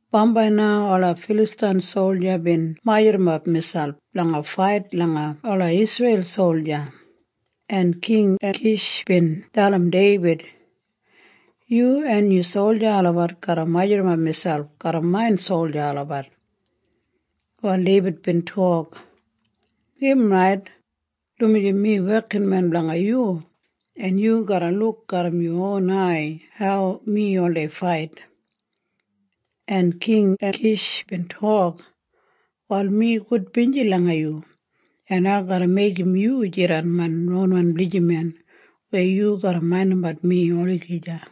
Bambai na ola Filastain solja bin majurrumap miselp blanga fait langa ola Isreil solja, en King Ekish bin dalim Deibid, “Yu en yu solja olabat garra majurrumap miselp garram main solja olabat.” Wal Deibid bin tok, “Im rait, dumaji mi wekinmen blanga yu, en yu garra luk garram yu ron ai hau mi oldei fait.” En King Ekish bin tok, “Wal mi gudbinji langa yu, en ai garra meigim yu jidan main ronwan blijiman weya yu garra maindimbat mi olagija.”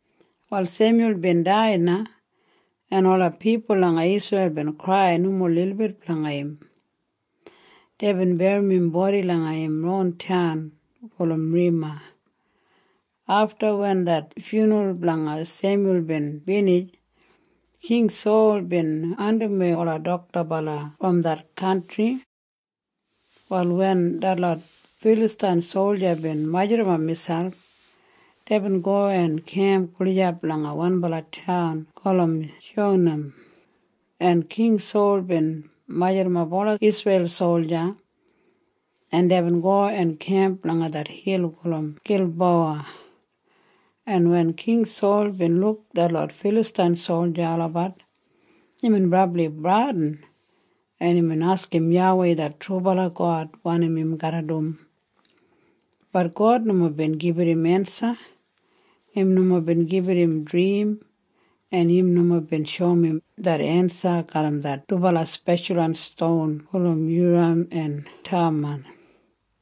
Wal Semyul bin dai na en ola pipul langa Isreil bin krai nomo lilbit blanga im. Deibin berrim im bodi langa im ronwan taun gulum Rema. Afta wen det fyunral blanga Semyul bin binij, King Sol bin andimwei ola doktabala brom det kantri. Wal wen detlot Filastain solja bin majurrumap miselp, deibin go en kemp gulijap langa wanbala taun gulum Shunam, en King Sol bin majurrumap ola Isreil solja, en deibin go en kemp langa det hil gulum Gilbowa, en wen King Sol bin luk detlot Filastain solja olabat, imbin brabli bradin, en imbin askim YAWEI det trubala God wanim im garra dum. Bat God nomo bin gibit im ensa. Im nomo bin gibit im drim, en im nomo bin shoum im det ensa garram det dubala speshalwan ston gulum Yuram en Thamam,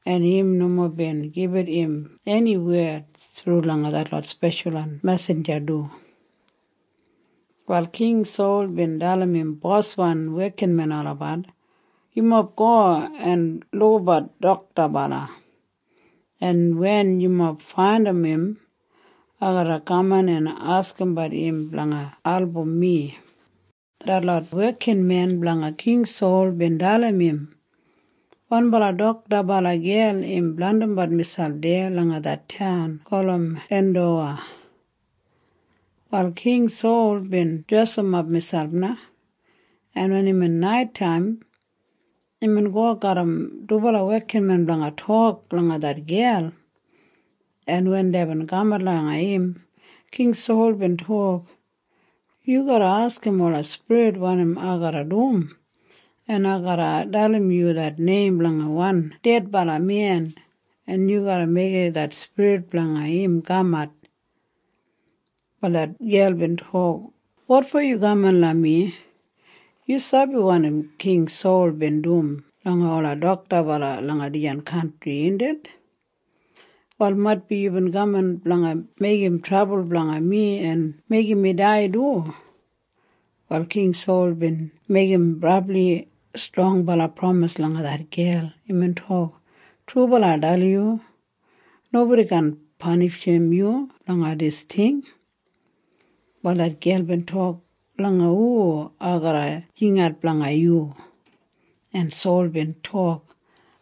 en im nomo bin gibit im eni wed thru langa detlot speshalwan mesinja du. Wal King Sol bin dalim im boswan wekinmen olabat, “Yumob go en lukabat doktabala, en wen yumob faindim im, ai garra kaman en askimbat im blanga album mi.” Detlot wekinmen blanga King Sol bin dalim im, “Wanbala doktabala gel im blandimbat miselp deya langa det taun gulum Endowa.” Wal King Sol bin dresimap miselp na, en wen imbin naitaim, imbin go garram dubala wekinmen blanga tok langa det gel, en wen deibin kamat langa im, King Sol bin tok, “Yu garra askim ola spirit wanim ai garra dum, en ai garra dalim yu det neim blanga wan dedbala men, en yu garra meigim det spirit blanga im kamat.” Wal det gel bin tok, “Wotfo yu kaman langa mi. Yu sabi wanim King Sol bin dum langa ola doktabala langa dijan kantri, indit? Wal maitbi yubin kaman blanga meigim trabul blanga mi en meigim mi dai du.” Wal King Sol bin meigim brabli strongbala pramis langa det gel. Imbin tok, “Trubala ai dalim yu. Nobodi kaan panishim yu blanga dis ting.” Wal det gel bin tok, “Langa hu ai garra jingat blanga yu?” En Sol bin tok,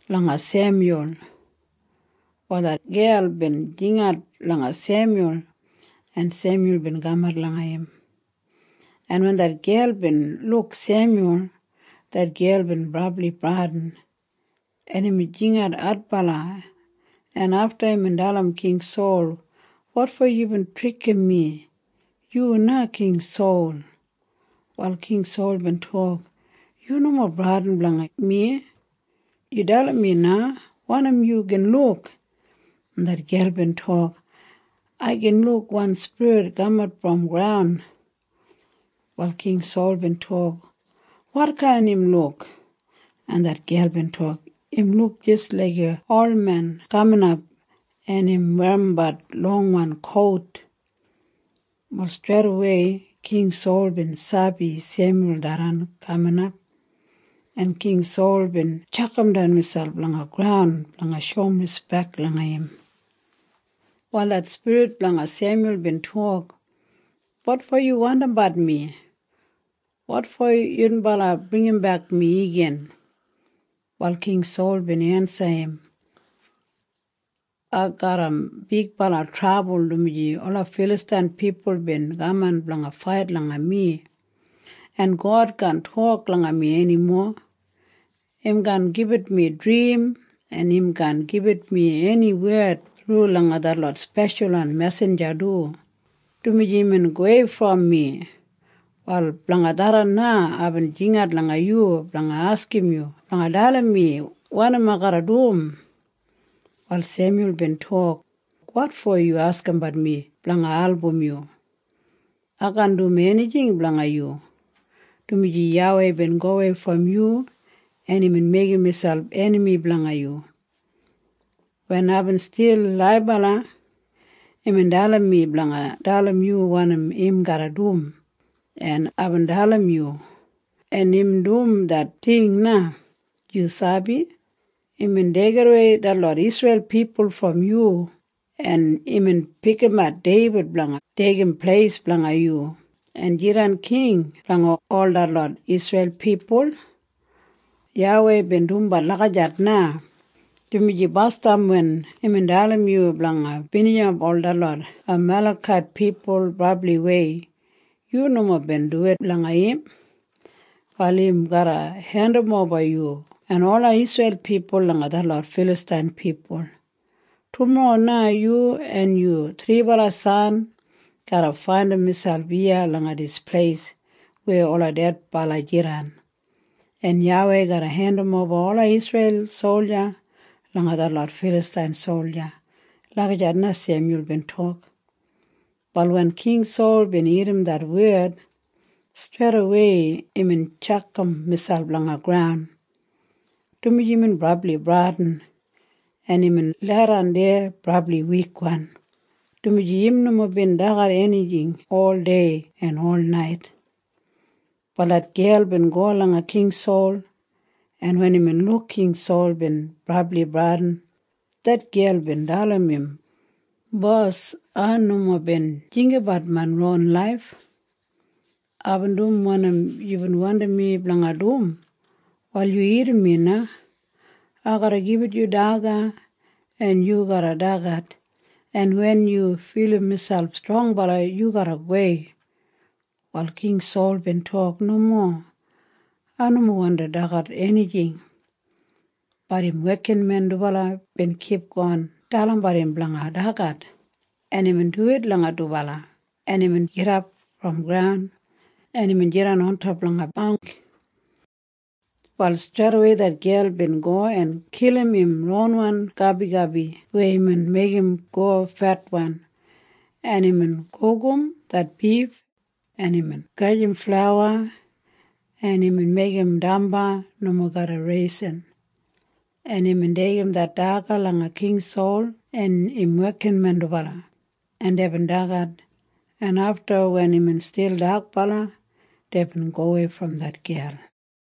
“Langa Semyul.” Wal det gel bin jingat langa Semyul, en Semyul bin kamat langa im, en wen det gel bin luk Semyul, det gel bin brabli bradin, en imbin jingat adbala, en afta imbin dalim King Sol, “Wotfo yubin trikim mi? Yu na King Sol.” Wal King Sol bin tok, “Yu nomo bradin blanga mi. Yu dalim mi na wanim yu gin luk.” En det gel bin tok, “Ai gin luk wan spirit kamat brom graun.” Wal King Sol bin tok, “Wotkain im luk?” En det gel bin tok, “Im luk jis laiga olmen kaminap, en im werrimbat longwan kout.” Wal streidawei King Sol bin sabi Semyul tharran kaminap, en King Sol bin tjakamdan miselp langa graun blanga shoum rispek langa im. Wal det spirit blanga Semyul bin tok, “Wotfo yu wandimbat mi? Wotfo yunbala bringimbek mi igin?” Wal King Sol bin ensim im, “Ai garram bigbala trabul, dumaji ola Filastain pipul bin kaman blanga fait langa mi, en God kaan tok langa mi enimo. Im kaan gibit mi drim, en im kaan gibit mi eni wed thru langa detlot speshalwan mesinja du, dumaji imbin gowei brom mi. Wal blanga tharran na aibin jingat langa yu blanga askim yu blanga dalim mi wanim ai garra dum.” Wal Semyul bin tok, “Wotfo yu askimbat mi blanga album yu. Ai kaan dum enijing blanga yu, dumaji YAWEI bin gowei brom yu, en imbin meigim miselp enami blanga yu. Wen aibin stil laibala, imbin dalim mi blanga dalim yu wanim im garra dum, en aibin dalim yu, en im dum det ting na. Yu sabi? Imbin deigidawei detlot Isreil pipul brom yu, en imbin pikimat Deibid blanga deigim pleis blanga yu en jidan king blanga ol detlot Isreil pipul. YAWEI bin dumbat lagijat na, dumaji basdam wen imbin dalim yu blanga binijimap ol detlot Amalekait pipul brabliwei, yu nomo bin duwit langa im. Wal im garra hendimoba yu en ola Isreil pipul langa detlot Filastain pipul. Tumorro na yu en yu thribala san garra faindim miselp iya langa dis pleis weya ola dedbala jidan, en YAWEI garra hendimoba ola Isreil solja langa detlot Filastain solja.” Lagijat na Semyul bin tok. Wal wen King Sol bin irrim det wed, streidawei imbin tjakam miselp langa graun, dumaji imbin brabli bradin, en imbin leidan deya brabli wikwan, dumaji im nomo bin dagat enijing ol dei en ol nait. Wal det gel bin go langa King Sol, en wen imbin luk King Sol bin brabli bradin, det gel bin dalim im, “Bos, ai nomo bin jinggabat main ron laif. Aibin dum wanim yubin wandim mi blanga dum. Wal yu irrim mi na. Ai garra gibit yu daga, en yu garra dagat, en wen yu filim miselp strongbala, yu garra gowei.” Wal King Sol bin tok, “Nomo. Ai nomo wandi dagat enijing.” Bat im wekinmen dubala bin kipgon dalimbat im blanga dagat, en imbin duwit langa dubala, en imbin gidap brom graun, en imbin jidan ontop langa bangk. Wal streidawei det gel bin go en kilim im ronwan gabigabi weya imbin meigim go fetwan, en imbin gugum det bif, en imbin gajim flauwa, en imbin meigim damba nomo garram raising, en imbin deigim det daga langa King Sol en im wekinmen dubala, en deibin dagat, en afta wen imbin stil dakbala, deibin gowei brom det gel.